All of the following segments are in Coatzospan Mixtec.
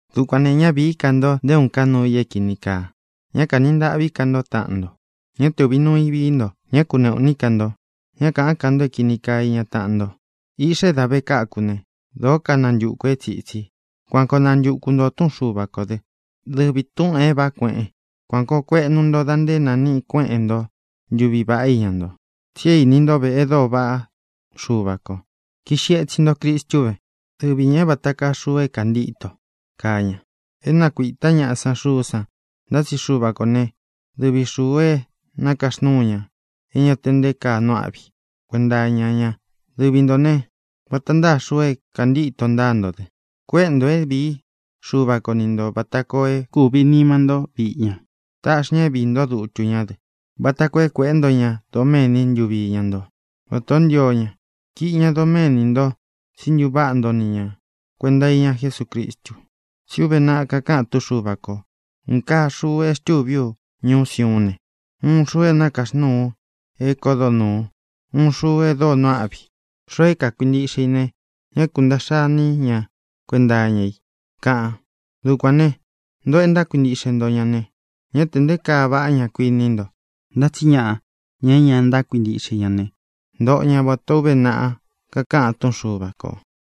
Dukuān ne, ñá vīí ka nto nté uun ká nuū i é kīni kaa. Ñá kanī ntaꞌví ka nto taꞌan nto. Ñá te ūvi nuu i vií nto. Ñá ku kuneꞌū iní ka nto. Ñá kāꞌán ka nto é kīni kaa iña taꞌan nto. Iꞌxa é dā ve káku ne, dōó kanantukū é tsītsi. Kuan koo nantūku nto túꞌun Xuva kō dɨ́, dɨvi tūꞌun é vāꞌá kueꞌen. Kuān koo kueꞌnu nto da nté nāniꞌi kuéꞌen nto ntuví vaꞌá iña nto. Tsi é īni ntó ve e dóo vaꞌá Xuva kō. Kiꞌxi etsin nto Cristu vé, dɨvi ñā é vata kaa xuu é kāntíto kaa ña. É nakuītá ñaꞌa san xuú san, ntá tsi Xuva kō né, dɨvi xūu é nakaxnúu ña, e ña te nté kaa nuu áꞌvi i kuenta iña ña. Dɨvi ntō né, vata ntáa xuu é kāntíto ntáa nto dɨ. Kuéꞌe ntō é vīí Xuva ko ni ntō vata koo é kūvi nima ntó viꞌi ña. Taꞌxi ña é viī ntó dutu ñá dɨ, vata koo é kueꞌé nto ña doméni ntuvi iña nto vata o ntío ña. Kiꞌi ña doméni nto, tsí ntuváꞌa nto ni ña kuēnta iña Jesúcristu. Tsí uve naꞌa kakaꞌan túꞌun Xuva kō: Uun kaa xuu e xtúvi ú ñuú Siuún ne, uun xuu é nakaxnúu u é kodo nūu, uun xuu e dóo nuu áꞌvi i. Xoo é kākuintiꞌxe i ne, ñá kuntāꞌxa iní ña kuenta iña i, kaꞌan. Dukuān né, ntōꞌo e ntákuintiꞌxe ntó ña ne, ñá tē nté kaa vaꞌá ña, kuiní nto. Ntá tsi ñaꞌa, ña é ña ntákuintiꞌxe i ña ne, ntoꞌo ña vatā ó uve naꞌa kakaꞌan túꞌun Xuva kō: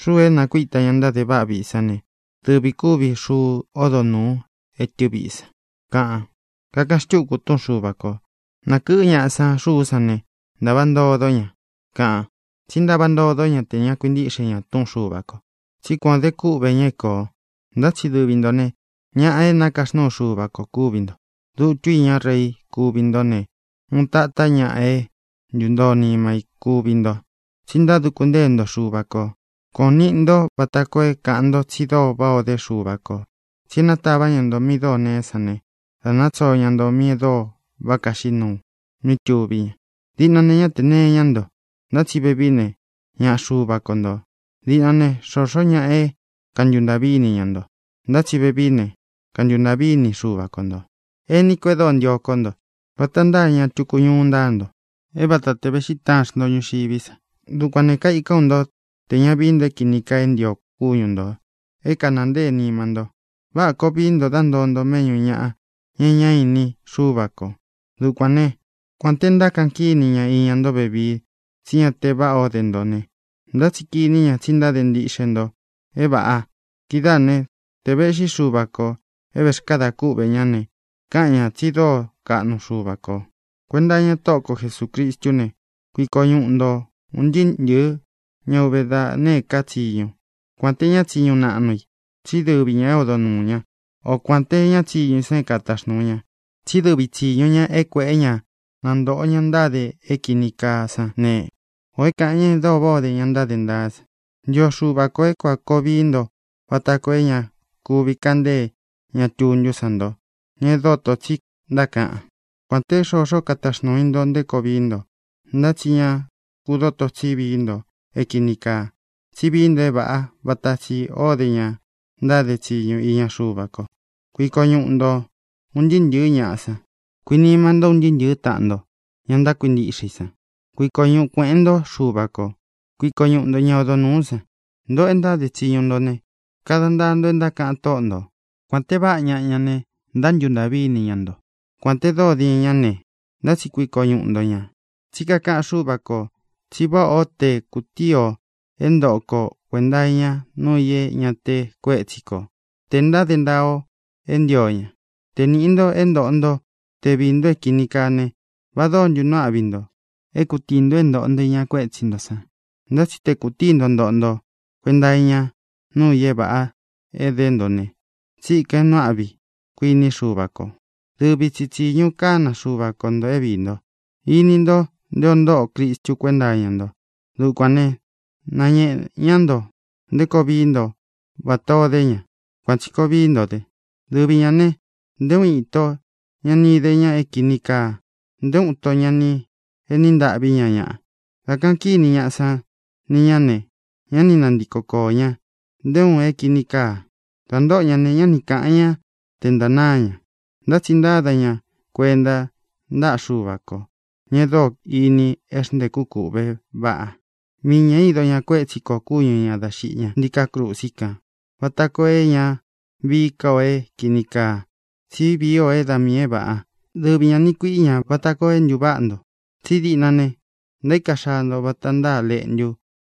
Xúū é nākuíta ña ntáde váꞌa viꞌi san ne, dɨvī kúvi xuu ódo nūu étɨ viꞌi san, kaꞌan. Kakaꞌan xtúku túꞌun Xuva kō: Nakɨꞌɨ́ ñaꞌa san xuú san ne, ntava ntodó ña, kaꞌan. Tsí ntava ntodó ña tē ña kuintíꞌxe ña túꞌun Xuva kō. Tsí kuan ō de kúꞌvē ña é kōo. Ntá tsi dɨvi ntō ne, ñaꞌa é nakaxnúu Xuva ko kúvi nto. Dutu iñá rei kúvi nto ne, uun tatá ñaꞌa é ntūntoo nima i kúvi nto, tsi ntáduku ntée nto Xuva kō. Kuān ó ni ntō vata koo é kāꞌan nto tsi dóo váꞌā o dé Xuva kō tsi e nátavā ñá nto míꞌī e dóo neé san ne, da tsóo ña nto míꞌī e dóo váꞌa kaxiꞌí nuu mí tuví ña. Diꞌna ne, ñá tē nee ñáꞌa nto, ntá tsi vevií ne, ñaꞌa Xuva ko ntō. Diꞌna ne, xoxó ñaꞌa é kantuntaꞌví ini ña nto, ntá tsi vevií ne, kantuntaꞌví ini Xuva ko ntō. Ení ko e dóo ntio kó nto, vata ntáa ña tuku ñuu ntáa nto, é vata te vēꞌxí taan xnto ñuxiví sa. Dukuān ne, kaikán u nto tē ña vií nto é kīni kaa é ntio kúñu ntō é kanāa ntée nima nto. Váꞌā koo vií nto dá ntoo nto méꞌñū ñaꞌa, ña e ñá ini Xúva kō. Dukuān né, kuān te ntákaꞌan kíni ña iña nto vevii tsí ña te váꞌā ó de nto ne, ntá tsi kiní ña tsi ntáde ntiꞌxe nto é vāꞌa. Kidáā né, te vēꞌxí Xuva kō é vēxkada kúꞌvē ñá ne, káꞌan ñā tsi dóo kaꞌnu Xuva kō. Kuenta iña Tóꞌo ko Jesūcristú ne, kuiko ñuꞌu nto ūn ntɨɨ́ ntɨ̄ɨ́ ña uve da nēé ka tsiñu, kuān té ña tsiñu naꞌnu i, tsí dɨvi ñā é odo nūu ña, o kuān té ña tsiñu i san é kataxnūu ña. Tsí dɨvi tsīñu ña é kuēꞌé ña na ntōꞌo ña ntáde é kīni kaa sán ne, ō é kāꞌan ña e dóo váꞌā ó de ña ntáde ntaá san. Ntio Xuva kō é kuān koo vií nto vata koo é ña kuvi kaꞌan ntée ña tuntú san nto, ña é dotō tsi ntákaꞌan. Kuān té xoxó ka taxnuu i nto nté koo vií nto, ntá tsi ña ku dotō tsí vií nto é kīni kaa, tsí vii nto é vāꞌá vata tsī ó de ña ntáde tsiñu iña Xuva ko. Kuiko ñuꞌu nto ūn ntɨɨ́ ntɨ̄ɨ́ ñaꞌa san. Kuinima nto un ntɨɨ́ ntɨ̄ɨ́ taꞌan nto, ña ntákuintiꞌxe i san. Kuiko ñuꞌu kuēꞌen ntó Xuva kō. Kuiko ñuꞌu ntō ñá odo nūú san. Ntoꞌo e ntáde tsiñu nto ne, kada ntaa nto e ntákaꞌan tóꞌo ntō. Kuān te váꞌa ñaꞌa ña ne, ntántuntaꞌví ini ña nto, kuān te dóo diin ñá ne, ntá tsi kuiko ñuꞌu nto ña. Tsí kakaꞌan Xúva kō tsi váꞌā ó te kutíi ō é ntoꞌo ko kuēnta iña nuu i é ña te kuétsi ko, tē ntáde ntaa o e ntío ña. Te nīꞌi nto é ntoꞌo nto te viī nto é kīni kaa ne, ¿va dóo ntu nuu áꞌvi nto e kūtíi nto é ntōꞌo nto iña kuétsi nto san? Ntá tsi te kūtíi nto ntoꞌo nto kuenta iña nuu i é vāꞌa é edé nto ne, tsíkān é nuu áꞌvi i, kuiní Xuva kō. Dɨvi tsi tsīñu kána Xuva ko ntō é viī nto. Ini nto nté o ntóꞌo Cristu kuenta iña nto. Dukuān ne, náñēꞌe ñá nto nté koo vií nto vatā o dé ña. Kuān tsi koo vií nto dɨ. Dɨvi ñā ne, nté uun ito ña ni ide ña é kīni kaa; nté uun ito ña ni eni ntâꞌví ña ñaꞌa. Dā kaꞌan kíni ñaꞌa san ni ñá ne, ñá ni nantiko koō ña nté uun é kīni kaa. Dā ntóꞌo ña ne, ñá ni kāꞌan ñá te ntanáa ña. Ntá tsi ntáda ña kuenta ntáꞌa Xuva kō, ña e dóo ini é xntēkú kūꞌvé vaꞌa. Mii ñā ído ña kuétsi kō kúñu ñā dá xiꞌi ña ntíkā krusi kan vata koo é ña vií ka ō é kīni kaa, tsí vii o da miī é vāꞌa. Dɨvi ñā niꞌi kuiꞌí ña vata koo é ntuváꞌa nto. Tsí diꞌna ne, ntaíka xaa nto vata ntáa leꞌntu,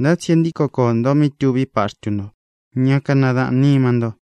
ntá tsi e ntíko koō nto mí tuví paxtu ntó, ña kanadaꞌān nima nto.